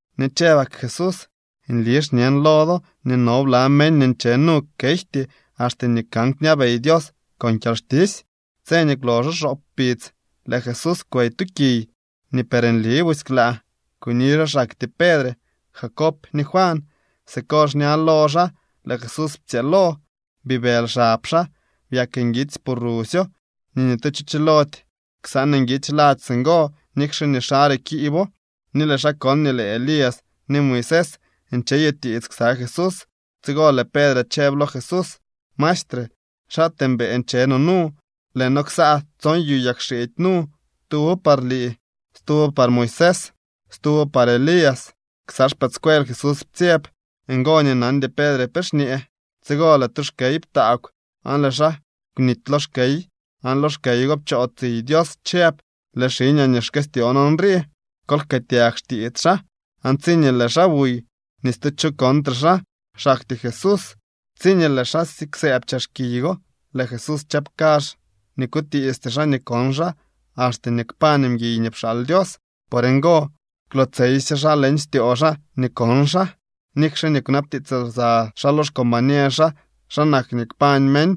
Ni chëbak Jesús: —Nli xñen lo do nii no bla meñ nii nche nu kejty axte nii kan kñabey Dios con kyalxtisy. Tse nii kwloxo xoop kpidz lëë Jesús kwey tu kiy nii per nli busy klaa. Kuni xaa xaktyee Pedre, Jacob ni Juan. Siko xña lo xaa lëë Jesús ptsyëëlo. Bibëly xab xaa, byak nguitsy pu rusyo ni ni tu cho chilody ksaan nguitsy ladx singo nikxe nii xare kiibo. Ni lëë xaa kon nii lëë Elías ni Moisés ncheyutiits ksa Jesús. Tsigo lëë Pedre chëb lo Jesús: —Maestre, ¡xaatee mbëë nche no nu! Lëë noo ksaa tson yu yagxiidy nu: tuwo par lii, stuwo par Moisés, stuwo par Elías. Ksa xpëëdscuel Jesús ptsyeb. Ngo nii nandy Pedre pe xñee. Tsigo lëë tu xkey ptaagw aan lëë xaa kwnity lo xkey. Aan lo xkey go pchoo tsiy Dios chëb: —Lëë xiñaa nii xkëstyoon nrii. Kol jkëëtyag xtiits xaa. Aan tsiñee lëë xaa buy, ni stu cho kontre xaa, xaktyee Jesús. Tsiñee lëë xaa siksëëb chex kiy go, lëë Jesús chëb kazh nii kwtiisty xaa nii kon xaa axte nii kpañ mguiy nii pxaal Dios. Por ngo kwlootseysye xaa leñ styoo xaa nii kon xaa, nikxe nii kwnabtiits lsa xaa lo xcombañer xaa xa nak nii kpañ meñ.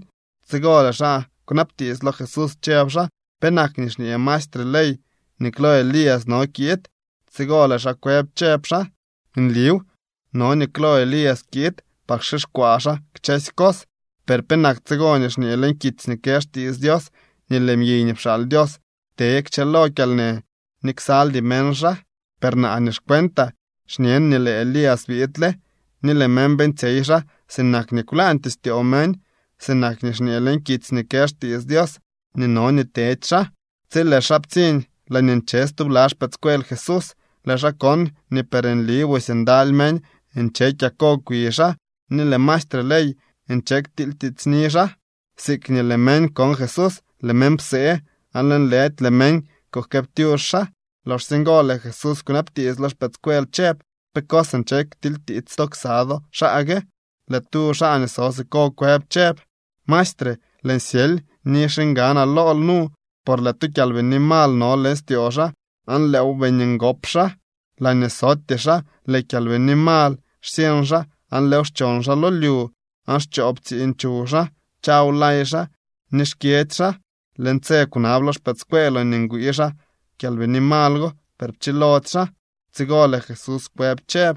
Tsigo lëë xaa kwnabtiits lo Jesús chëb xaa: —¿Penak nii xñee maestre ley nii klo Elías no nii kiid? Tsigo lëë xaa kwëb chëb xaa: —Nliw, no nii klo Elías kiid par kxixkwaa xaa kchësy cos. ¿Per penak tsigo nii xñee leñ kitsy nii kë xtiits Dios nii lëë mguiy nii pxaal Dios te kchëlo kyalnë ni ksaldy meñ xaa? Per naa nii xcuentaa xñen nii lëë Elías biidle ni lëë meñ beeñtsyey xaa sinak nii kwlaañtyee styoo meñ, sinak nii xñee leñ kitsy nii kë xtiits Dios nii no nii tedy xaa. Tsi lëë xaa ptsiñ laañee nche stubla xpëëdscuel Jesús, lëë xaa kon nii per nli busy ndaly meñ nche kyako kwi xaa, ni lëë maestre ley nche ktilytiitsni xaa. Siikñee lëë meñ kon Jesús, lëë meñ psee aan lëënlëdy lëë meñ kujkëëptyux xaa. Loxsye ngo lëë Jesús kwnabtiits lo xpëëdscuel chëb: —¿Pe cos nche ktilytiits to ksa do xaa gue? Lëë tu xaa nii so siko kwëb chëb: —Maestre, lëën syely ni xiñganaa lool nu por lëë tu kyalbini mal no leñ styoo xaa aan lëëw beeñ ngop xaa. Laañee sotyee xaa lëë kyalbini mal xsyeñ xaa aan lëëw xchon xaa lyu. Aan xchoo ptsiñ chuw xaa, chaw lay xaa ni xkyedzy xaa. Lëën tse kwnab lo xpëëdscueeloo nii ngwii xaa kyalbini mal go, per pchilody xaa. Tsigo lëë Jesús kwëb chëb: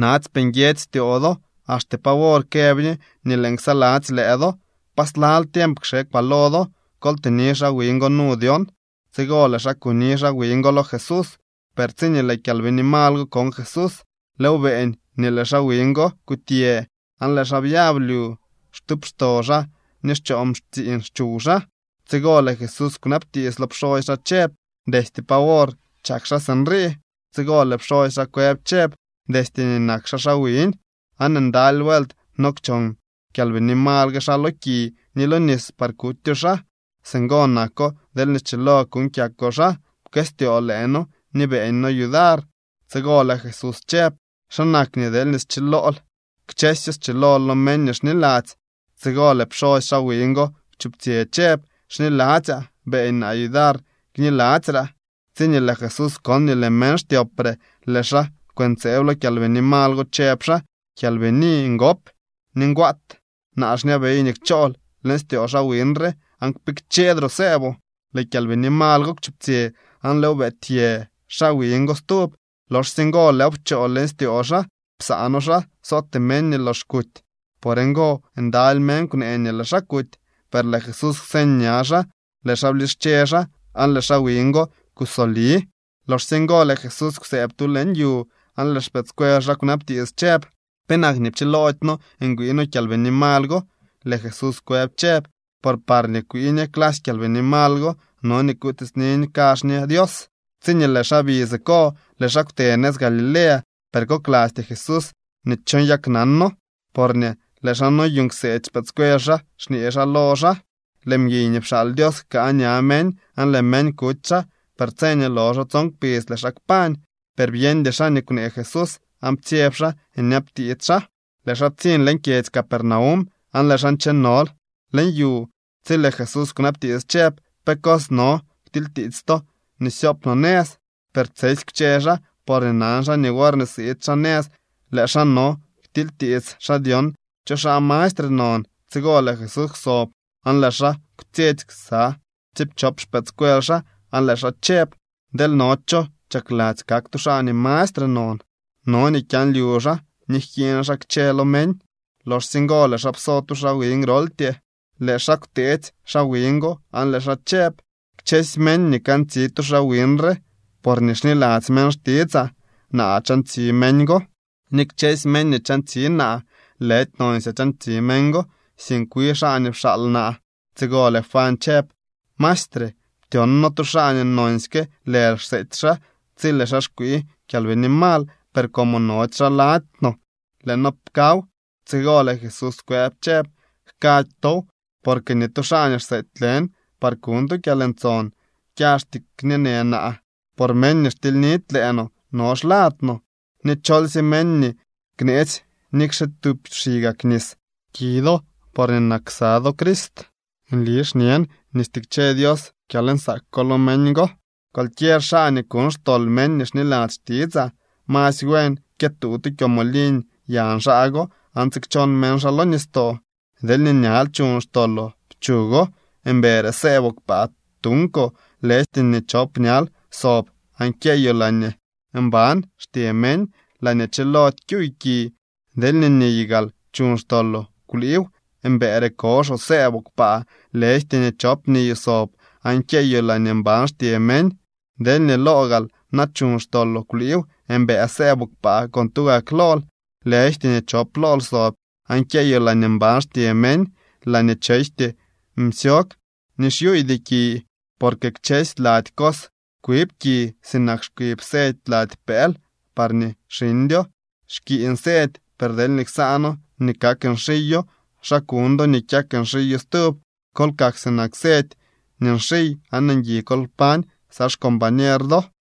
—¡Natsypee nguiedzy styoo do! ¿Axte pa wor këb ñe nii lëën ksaladzy lëë do? ¿Pa slal tiemp kxekwaa lo do? Kol tëni xaa wiñ go nu dyon. Tsigo lëë xaa kuni xaa wiñ go lo Jesús. Per tsiñee lëë kyalbini mal go kon Jesús, lëëw beeñ nii lëë xaa wiñ go kutyë, aan lëë xaa byab lyu xtuupxto xaa ni xchoo ptsiiñ chuw xaa. Tsigo lëë Jesús kwnabtiits lo pxosy xaa chëb: —¿Destye pa wor chak xaa sinrii? Tsigo lëë pxosy xaa kwëb chëb: —Destye nii nak xaa xaa wiñ. Aan ndaly vuelt no kchon kyalbini mal gue xaa lo ki ni lo nis par kutyo xaa. Singo nako deelñee schilo kuuñ kyakoo xaa, pkëstyoo lëë noo ni beeñ noo yudar. Tsigo lëë Jesús chëb: —¿Xa nak nii deelñee schilool? Kchësyo schilo lo meñ nii xniladzy. Tsigo lëë pxosy xaa wiñ go kwchuptsyë chëb: —¡Xniladzyaa; beeñ naa yudar kniladzyraa! Tsiñee lëë Jesús kon nii lëë meñ xtyopre, lëë xaa kwëntseeb lo kyalbini mal go chëb xaa: —Kyalbini ngop ni ngwaat, naa xñabey nii kchool leñ styoo xaa wiñ re aan kpikchedroo sëëboo. Lëë kyalbini mal go kwchuptsyë, aan lëëw beetyë xaa wiñ go stub. Loxsye ngo lëëw pchoo leñ styoo xaa, psaano xaa sootee meñ nii lox kuty. Por ngo ndaly meñ kwnee nii lëë xaa kuty. Per lëë Jesús kwseñ ña xaa, lëë xaa blische xaa, aan lëë xaa wiñ go kusoli. Loxsye ngo lëë Jesús kwsëëb tu leñ yu, aan lëë xpëëdscuel xaa kwnabtiits chëb: —¿Penak nii pchiloody noo ngwii noo kyalbini mal go? Lëë Jesús kwëb chëb: —Por parñee kwii ñe clasy kyalbini mal go no nii kutiitsni kazh ñe Dios. Tsiñee lëë xaa bi siko, lëë xaa kwte nëz Galilea. Per koklasty Jesús nii cho nyaknano porñee lëë xaa noyuuñ kseedy xpëëdscuel xaa xñee xaa lo xaa: —Lëë mguiy nii pxaal Dios jkaa ña meñ, aan lëë meñ kuty xaa. Per tse nii loxo tson kpidz lëë xaa kpañ. Per byeñdy xaa nii kwnee Jesús aan ptsyeb xaa nyabtiits xaa. Lëë xaa ptsiñ leñ kyedzy Capernaum, aan lëë xaa nchenol leñ yu tsi lëë Jesús kwnabtiits chëb: —¿Pe cos no ktilytiits to nii syoop no nëz? Per tsesy kwche xaa, porñee nan xaa nii worñee siid xaa nëz lëë xaa no ktilytiits xaa dyon cho xaa mastre non. Tsigo lëë Jesús kwsob aan lëë xaa kwtsyetsy ksa tsiipchop xpëëdscuel xaa aan lëë xaa chëb: —Deel no cho chakladzy kak tu xaa nii mastre non, no nii kyaanlyu xaa ni jkiiñ xaa kchë lo meñ. Loxsye ngo lëë xaa pso tu xaa wiñ groltyee, lëë xaa kwteetsy xaa wiñ go aan lëë xaa chëb: —Kchësy meñ nii kantsi tu xaa wiñ re porñee xniladzy meñ xtitsaa, naa chantsi meñ go. Ni kchësy meñ nii chantsi naa, lëdy nonsyaa chantsi meñ go, sink wi xaa nii pxaal naa. Tsigo lëë Juan chëb: —Maestre, ptyon noo tu xaa nii nonsyke lël xseety xaa tsi lëë xaa kwii kyalbini mal, per como nody xaa lady no lëë noo pkaw. Tsigo lëë Jesús kwëb chëb: —Jkady tow, porque ni tu xaa nii xseety lën par kuñ tu kyalntson kyaxty kñeenë naa. Por meñ nii xtilynidy lëë no, no xlad no. Ni cholsye meñ nii kneetsy nikxe tub xigak nis ki do porñee nak ksa do Crist, nli xñen nii stikche Dios kyalnsaak ko lo meñ go. ’Cualquier xaa nii kuñ xtol meñ nii xniladzy xtitsaa, masy buen kyëtuu tu kyomoliñ yañ xaa go aan tsikchon meñ xaa lo nistoo. Deelñee ñal chuñ xtoloo, pchugo. Mbëëre sëëboo kpaa tunkoo, lëjty nii chop ñal sob aan kyeyoo laañee mban xtye meñ, laañee chilody kyuuy ki. Deelñee niy gaal chuñ xtoloo, kwliiw. Mbëëre koxoo sëëboo kpaa, lëjty nii chop niyoo sob aan kyeyoo laañee mban xtye meñ. Deelñee loo gaal na chuñ xtoloo, kwliiw. Mbëë sëëboo kpaa con tugak lool, lëjty nii chop lool sob aan kyeyoo laañee mban xtye meñ, laañee chejty msyog ni xyuuydy ki. ’Porque kchësy lady cos kwib ki sinak xkwib sedy lady pëël parñee xiñdyo. Xkiiñ sedy. Per deelñee ksaano nii kak nxiyo, ¿xa kuñ do nii kyak nxiyo stub? Kol kak sinak sedy nii nxiy aan ngui kol kpañ ksa xcombañer do.